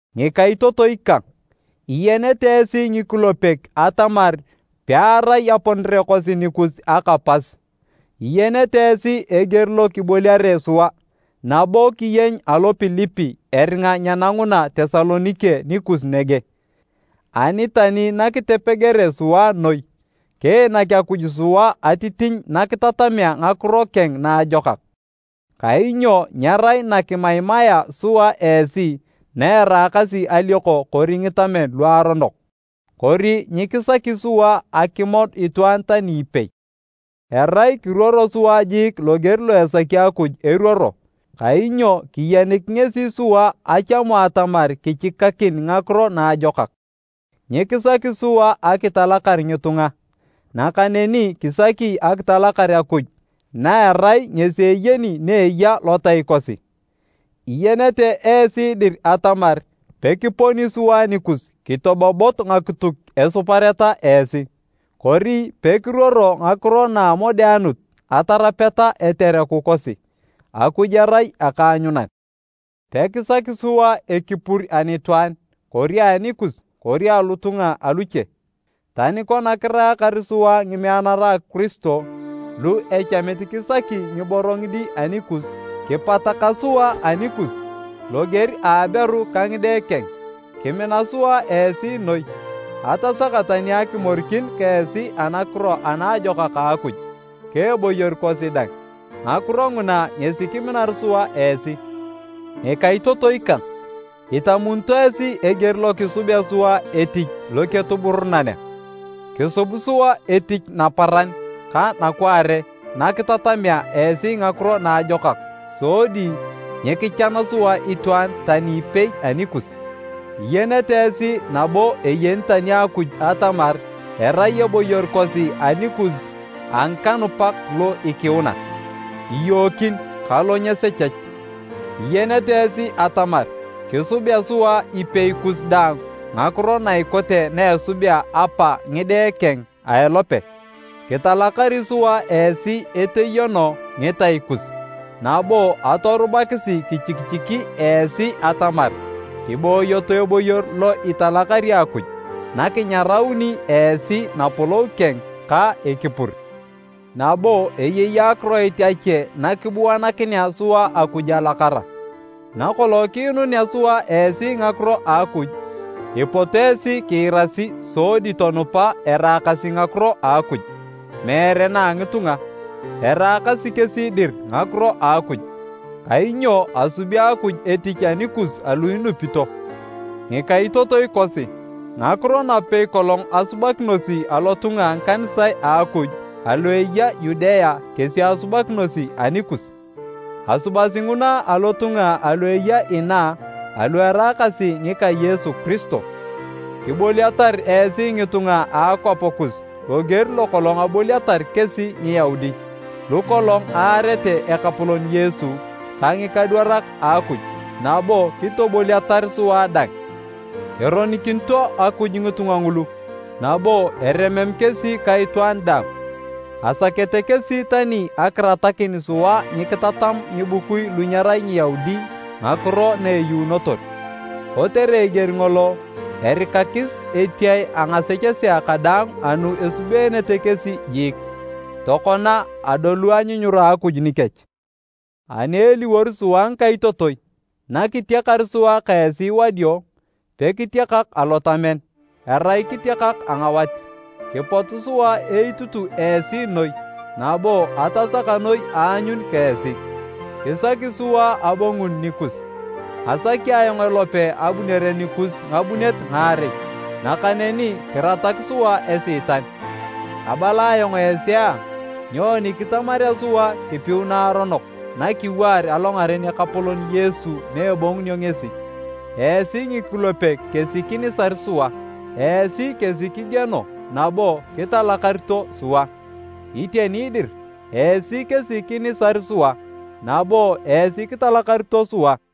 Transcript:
Ngikaitotoi kang, iyenete esi ngikulepek atamar pearai aponere kosi nikus aka pas. Iyenete esi eger lo kiboliare sua nabo kiyeny alo Pilipi eringa nyenanguna Tesalonike nikus nege. Ani tani nakitepegere sua noi, kiinak Akuj sua atitinyu nakitatamea Ngakiro keng Naajokak. Kainyo nyerai na kimaimaea sua esi na eraakasi alioko kori ngitamen luaronok, kori nyikisaki sua akimod itwaan tani ipei. Erai kiruoro sua jiik loger lo esaki Akuj eruoro, kainyo kiyenik ngesi sua achamu atamar kichikakin Ngakiro Naajokak. Nyikisaki sua akitalakar ngitunga, nakaneni kisaki akitalakar Akuj na erai ngesi eyeni na eya lotai kosi. Iyenete esi dir atamar pekiponi sua nikus kitobobot ngakituk esupareta esi, kori pekiruoro ngakiro na a amodeanut atarapeta etereku kosi, Akuj erai akaanyunan! Pekisaki sua ekipur anitwaan kori anikus kori alotunga aluche, tani kona kiraakar sua ngimeanara a Kiristo lu echamit kisaki ngiboro ngidi anikus, kipataka sua anikus loger a aberu ka ngide keng. Kimina sua esi noi atasaka tani akimorikin ka esi Anakiro Anaajokak a Akuj ka eboyor kosi dang. Ngakiro nguna ngesi kiminar sua esi! Ngikaitotoi kang, itamunito esi eger lo kisubea sua etich loketuburunan! Kisubi sua etich naparan ka nakwaare nakitatamea esi Ngakiro Naajokak sodi nyikichan sua itwaan tani ipei anikus. Iyenete esi nabo eyeni tani Akuj atamar erai eboyor kosi anikus a ngikanupak lo ikiuna, iyookin ka lo nyesechech. Iyenete esi atamar kisubea sua ipei kus daang ngakiro na ikote na esubea apa ngide keng a elope. Kitalakari sua esi eteyono ngitai kus nabo atorubakisi kichikichiki esi atamar kiboyoto eboyor lo italakari Akuj nakinyarauni esi Napolou keng ka ekipur. Nabo eyei akiroit ache nakibuanakinea sua Akuj alakara. Nakolong kiinunea sua esi Ngakiro a Akuj, ipot esi kiirasi sodi tonupa eraakasi ngakiro a Akuj, meere na a ngitunga. Eraakasi kesi dir ngakiro a Akuj. Kainyo asubi Akuj etich anikus alu inupito. Ngikaitotoi kosi, ngakiro napei kolong asubakinosi alotunga a ngikanisae a Akuj alu eya Yudea kesi asubakinosi anikus. Asubasi nguna alotunga alu eya inaa alu eraakasi ngika Yesu Kiristo. Kiboliatar esi ngitunga a akwap kus loger lokolong aboliatar kesi Ngiyaudi, lukolong aarete Ekapolon Yesu ka ngikadwarak a Akuj nabo kitoboliatar sua dang! Eronikinito Akuj ngitunga ngulu nabo eremem kesi ka itwaan daang! Asakete kesi tani akiratakin sua nyikitatam ngibukui lu nyerai Ngiyaudi ngakiro na eyuunotor. Kotere eger ngolo, erikakis etiae a ngasechesea kadaang anu esubeenete kesi jiik. Tokona adolu anyunyura a Akuj nikech! Ani eliwor sua ngikaitotoi, nakitiakar sua ka esi wadio, pekitiakak alotamen, arai kitiakak a ngawat, kipot sua eitutu esi noi nabo atasaka noi aanyun ka esi! Kisaki sua abonguni nikus. Asaki ayong elope abunere nikus ngabunet ngaarei, nakaneni kiratak sua Esiitan. Abala ayong esi a! Nyoni kitamarea sua kipiu naaronok nakiwaar alongaren Ekapolon Yesu na ebongunio ngesi? Esi ngikulepek kesi kinisar sua, esi kesi kigieno nabo kitalakarito sua. Iteni dir, esi kesi kinisar sua nabo esi kitalakarito sua!